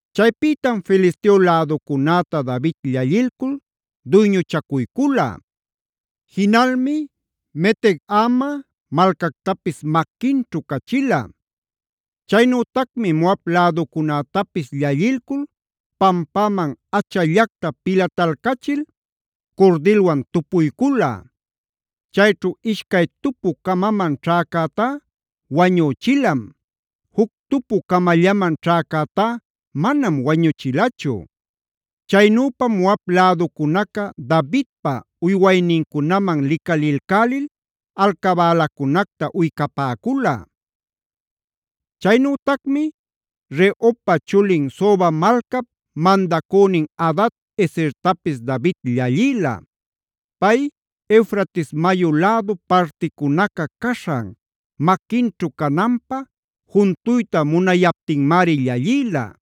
Chaypïtam Filisteo läducunäta David llallilcul duyñuchacuycula. Jinalmi Meteg-ama malcactapis maquinćhu cachila. Chaynütacmi Moab läducunätapis llallilcul pampäman achallacta pilatalcachil curdilwan tupuycula. Chayćhu ishcay tupu-camaman ćhäcätá wañüchilam; juc tupu-camallaman ćhäcätá manam wañuchilachu. Chaynüpam Moab läducunaca Davidpa uywaynincunaman licalilcälil alcabälacunacta uycapäcula. Chaynütacmi Rehobpa chulin Soba malcap mandacünin Hadad-ezertapis David llallïla. Pay Eufrates mayu lädu particunaca caśhan maquinćhu cananpä juntuyta munayaptinmari llallïla.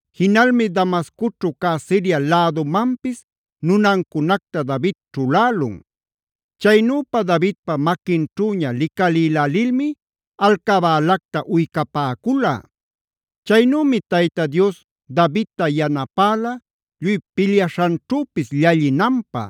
Jinalmi Damascoćhu cä Siria lädumanpis nunancunacta David ćhulälun. Chaynüpa Davidpa maquinćhüña licalïlälilmi alcabälacta uycapäcula. Chaynümi Tayta Dios Davidta yanapäla lluy pilyaśhanćhüpis llallinanpä.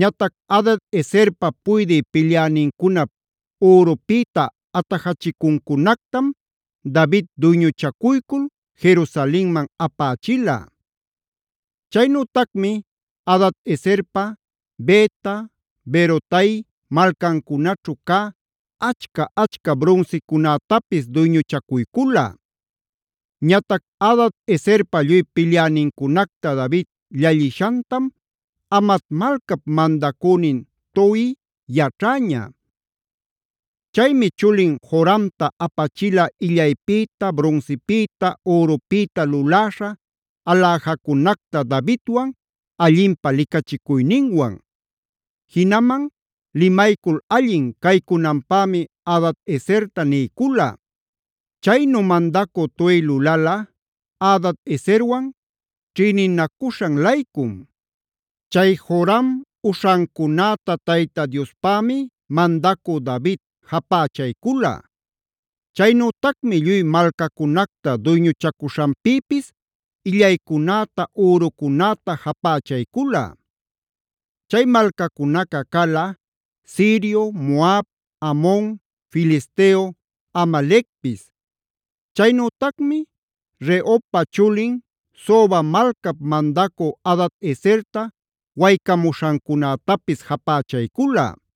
Ñatac Hadad-ezerpa puydï pilyänincunap ürupïta atajachicuncunactam David duyñuchacuycul Jerusalenman apächila. Chaynütacmi Hadad-ezerpa Beta, Berotai malcancunaćhu cä achca-achca brunsicunätapis duyñuchacuycula. Ñatac Hadad-ezerpa lluy pilyänincunacta David llallishantam Hamat malcap mandacünin Toi yaćhäña. Chaymi chulin Joramta apachila illaypïta, brunsipïta, ürupïta luläśha aläjacunacta Davidwan allinpä licachicuyninwan. Jinaman limaycul allin caycunanpämi Hadad-ezerta niycula. Chaynu mandacü Toi lulala Hadad-ezerwan ćhïninacuśhan-laycum. Chay Joram uśhancunäta Tayta Diospämi mandacü David japächaycula. Chaynütacmi lluy malcacunacta duyñuchacuśhanpïpis illaycunäta, ürucunäta japächaycula. Chay malcacunaca cala: Sirio, Moab, Amon, Filisteo, Amalecpis. Chaynütacmi Rehobpa chulin, Soba malcap mandacü Hadad-ezerta waycamuśhancunätapis japächaycula.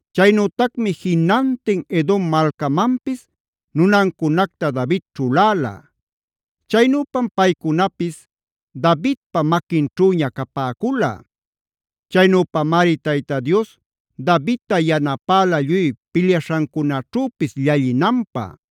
Chaynütacmi jinantin Edom malcamanpis nunancunacta David ćhuläla. Chaynüpam paycunapis Davidpa maquinćhüña capäcula. Chaynüpamari Tayta Dios Davidta yanapäla lluy pilyaśhancunaćhüpis llallinanpä.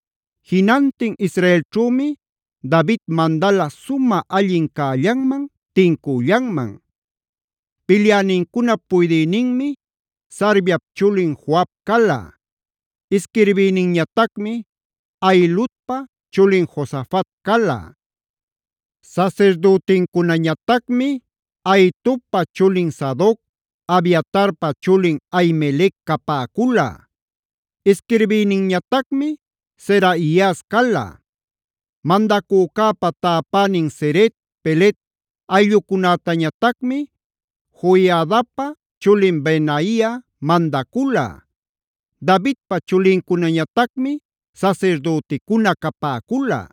Jinantin Israelćhümi David mandala sumä allin cällanman, tincüllanman. Pilyänincunap puydïninmi Sarviap chulin Joab cala; isquirbïninñatacmi Ahiludpa chulin Josafat cala. Sasirdütincunañatacmi Ahitobpa chulin Sadoc, Abiatarpa chulin Ahimelec capäcula. Isquirbïninñatacmi Seraias cala. Mandacücäpa täpänin Ceret, Pelet ayllucunätañatacmi Joiadapa chulin Benaia mandacula. Davidpa chulincunañatacmi sasirdüticuna capäcula.